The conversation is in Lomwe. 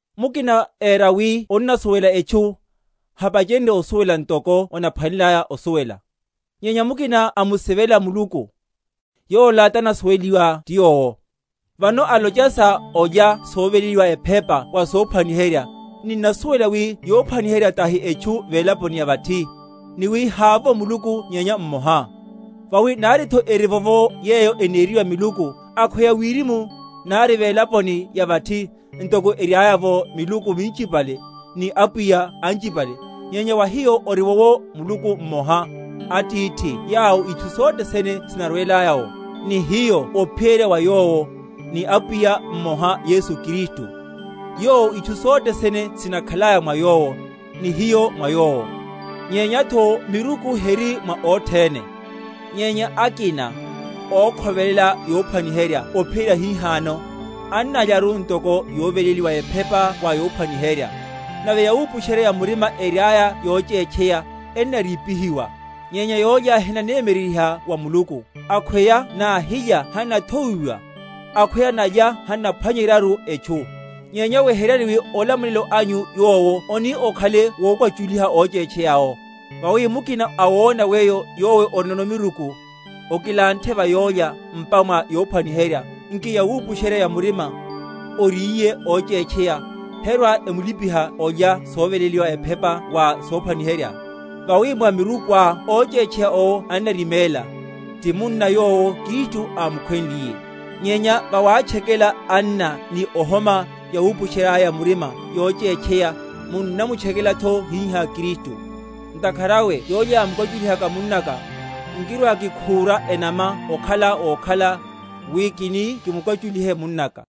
Mukina éra wi onnasuwela etchu, hapachenrye osuwela ntoko onaphwaneleliye osuwela. Nyenya mukina amusivela Muluku, yola tanasuweliwa ti Yowo. Vano olocha sa olya soveléliwa ephepa wa sophwaniherya, ninnasuwela wi yophwaniherya tahi etchu velaponi ya vathi, ni wi havovo Muluku nyenya mmoha. Vawi naritho erivovo yeyo eneriwa miluku, akhweya wirimu, nari velaponi ya vathi, ntoko eriaya’vo miluku minchipale, ni apwiya anchipale; nyenya wa hiyo oriwowo Muluku mmoha, Atithi yawo itchu sothe sene sinarwelaya’wo, ni hiyo ophiyerya wa Yowo; ni Apwiya mmoha Yesu Kristu, yowo itchu sothe sene sinakhalaya mwa Yowo, ni hiyo mwa Yowo. Nyenyatho miruku heri mwa othene; nyenya akina, ókhovelela yophwaniherya ophiyerya hihano, annalyaru ntoko yoveléliwa ephepa wa yophwaniherya; nave yawupusherya‐ya‐murima eriaya yochétcheya, ennarípihiwa. Nyenya yólya henanemyeryeryiha wa Muluku; akhweya nahilya hannathowiwa; akhweya nalya hannaphwanyeryaru etchu. Nyenya weheryani wi olamulelo anyu yowo oni okhale wokwachuliha óchétcheya awo. Vawi mukina awona weyo yowe orinono miruku, okilanthe va yólya m’pa ya yophwaniherya, nki yawupusherya‐ya‐murima, oríye óchétcheya, herwa‐emulipiha olya soveléliwa ephepa wa sophwaniherya? Vawi mwa mirukuá óchétcheya owo annariméla, ti munna yowo Kristu ámukhwenliye. Nyenya vawatchekela anna, ni ohoma yawupusherya‐ya‐murima yochétcheya, munnamutchekelatho hihá Kristu. Ntakhara awe, yólya yamukwachuliha munnaka, nkirwakikhúra enama okhala wokhala, wi kini kimukwachulihe munnaka.